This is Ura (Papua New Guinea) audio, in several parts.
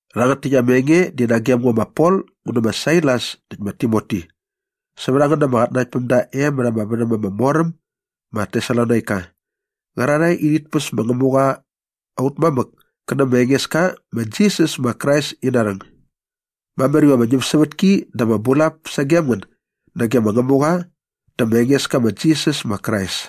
Rhangät täkt ama enge di nagem ngo ma Pol ngu nä ma Sailas näkt ma Timoti sävät a ngän ama qatnanaktpämda e mät ama värhäm ama mor äm ma Tesalonaika qärarhae i rhit päs ma Ngämuqa aut mamäk kä nä ma Engeska ma Jisas ma Krais ina rhäng. Mamär iva ama ñämsävätki dä ama bulap sagem ngän nage ma Ngämuqa dä ma Engeska ma Jisas ma Krais.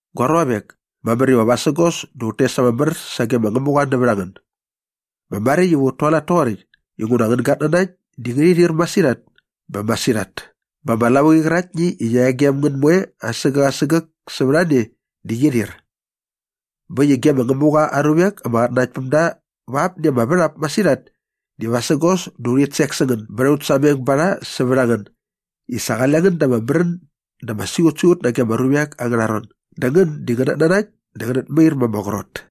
Gua ruavek, mamär iva vasägos dä ut tes ama mär sage ma Ngämuqa nävät a ngän. Bä maräkt iva ut tualat toqoräkt inguna angän gatnanakt di ngärhi rhir masirhat bä masirhat bä ama lavuqi qäraktni i qia e gem ngän moe asägäk asägäk sävät a ne di qi rhir. Bä äkt i ge ma Ngämuqa aa ruvek ama qatnanaktpämda va apni ama värhap masirhat di vasägos dä urhit sek sä ngän bät aut sameng ba rha sävät a ngän i sa qale ngän da ama märän dä ama siqutsiqut nage ama ruvek angärha ron dä ngän di ngänät nanakt dä ngänät mair ma ama qrot.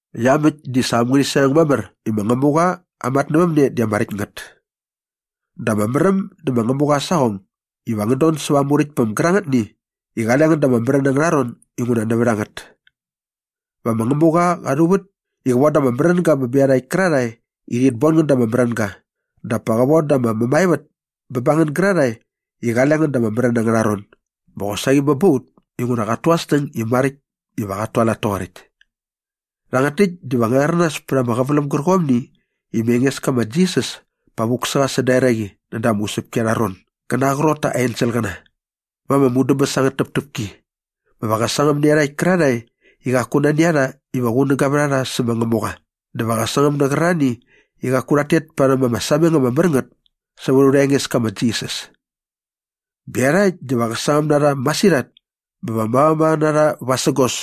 Iamäkt di sa am ngärhi sameng mamär i ma Ngämuqa aa matnävämne di ama räkt ngät. Dä ama märäm dä ma Ngämuqa aa saqong iva ngän don säva aa Muräktpäm gärangätni i qale ngän da ama märän angärha ron inguna nävät a ngät. Va ma Ngämuqa qa rhuvät i qä von da ama märänga bä bä iarhakt kärarhae i rhit bon ngän da ama märänga dap pa qä von da ama mämaevät bä ba ngän gärarhae i qale ngän da ama märän angärha ron bä qosaqi bä ba ut inguna qat tu aa snäng i maräkt iva qat tualat toqoräkt. Rhangät täkt diva ngä rhäranas pät ama qäväläm gärqomni i ma Engeska ma Jisas pa vuk sä qa säda eraqi näda ama usäpki arha ron gä na aa qrot ta aa enselqäna va ama mudäbäs angät täptäpki. Bä va qä sangäm nä iarhakt kärarhae i qaku nani a rha iva qunäga vät a rha sä ma Ngämuqa dä va qä sangäm nä qärarhani i qaku rhat tet parhäm ama sameng ama mär ngät sävät aurha Engeska ma Jisas. Bä iarhakt diva qä sangäm na rha masirhat bä va mavamava na rha vasägos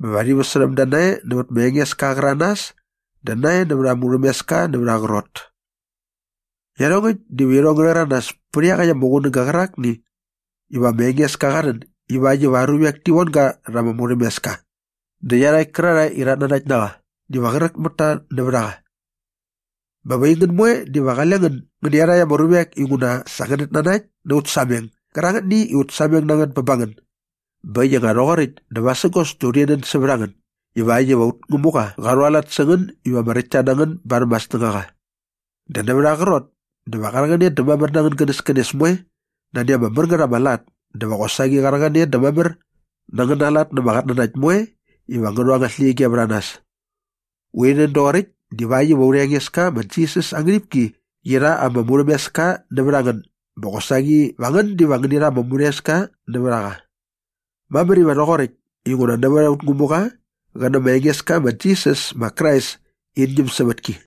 bä va rhi väsärhäm da nae nävät ma Engeska aa qäranas dä nae näva aa murhämeska nävät aa qrot. Iarhongäkt diva irhong ngä rhäranas pät iaqäkt ama qunäga qärakni iva ma Engeska qa rhän ivakt iva aa ruvek ti von ga rha ama murhämeska dä iarhakt kärarhae i rhat nanakt na qa diva qräk mät ta nävät a qa. Bä va aingän moe diva qale ngän ngän nä iarhakt ama ruvek inguna sa ngänät nanakt na aut sameng gärangätni i sa ut sameng na ngät bä ba ngän. Bä äkt i nga rhoqoräkt dä vasägos dä urhi nän sävät a ngän ivakt iva aut Ngämuqa qa rhualat sä ngän iva ama räktta na ngän barhäm aa snängaqa. Dä nävät aa qrot dä va qa rhäqäne dä mamär na angän gänäskänes moe nani ama mär ngät ama lat dä va qosaqi qa rhäqäne dä mamär na angäna lat na ama qatnanakt moe iva ngä rhu angät släqyige vät a nas. Urhi nän doqoräkt divakt iva aurha Engeska ma Jisas aa ngärhipki qi rha ama murhämeska nävät a ngän bä qosaqi va ngän diva ngäni rha ama murhämeska nävät a qa. Mamär iva rhoqoräkt inguna nävät aut Ngämuqa qä nä ma Engeska ma Jisas ma Krais in ñämsävätki.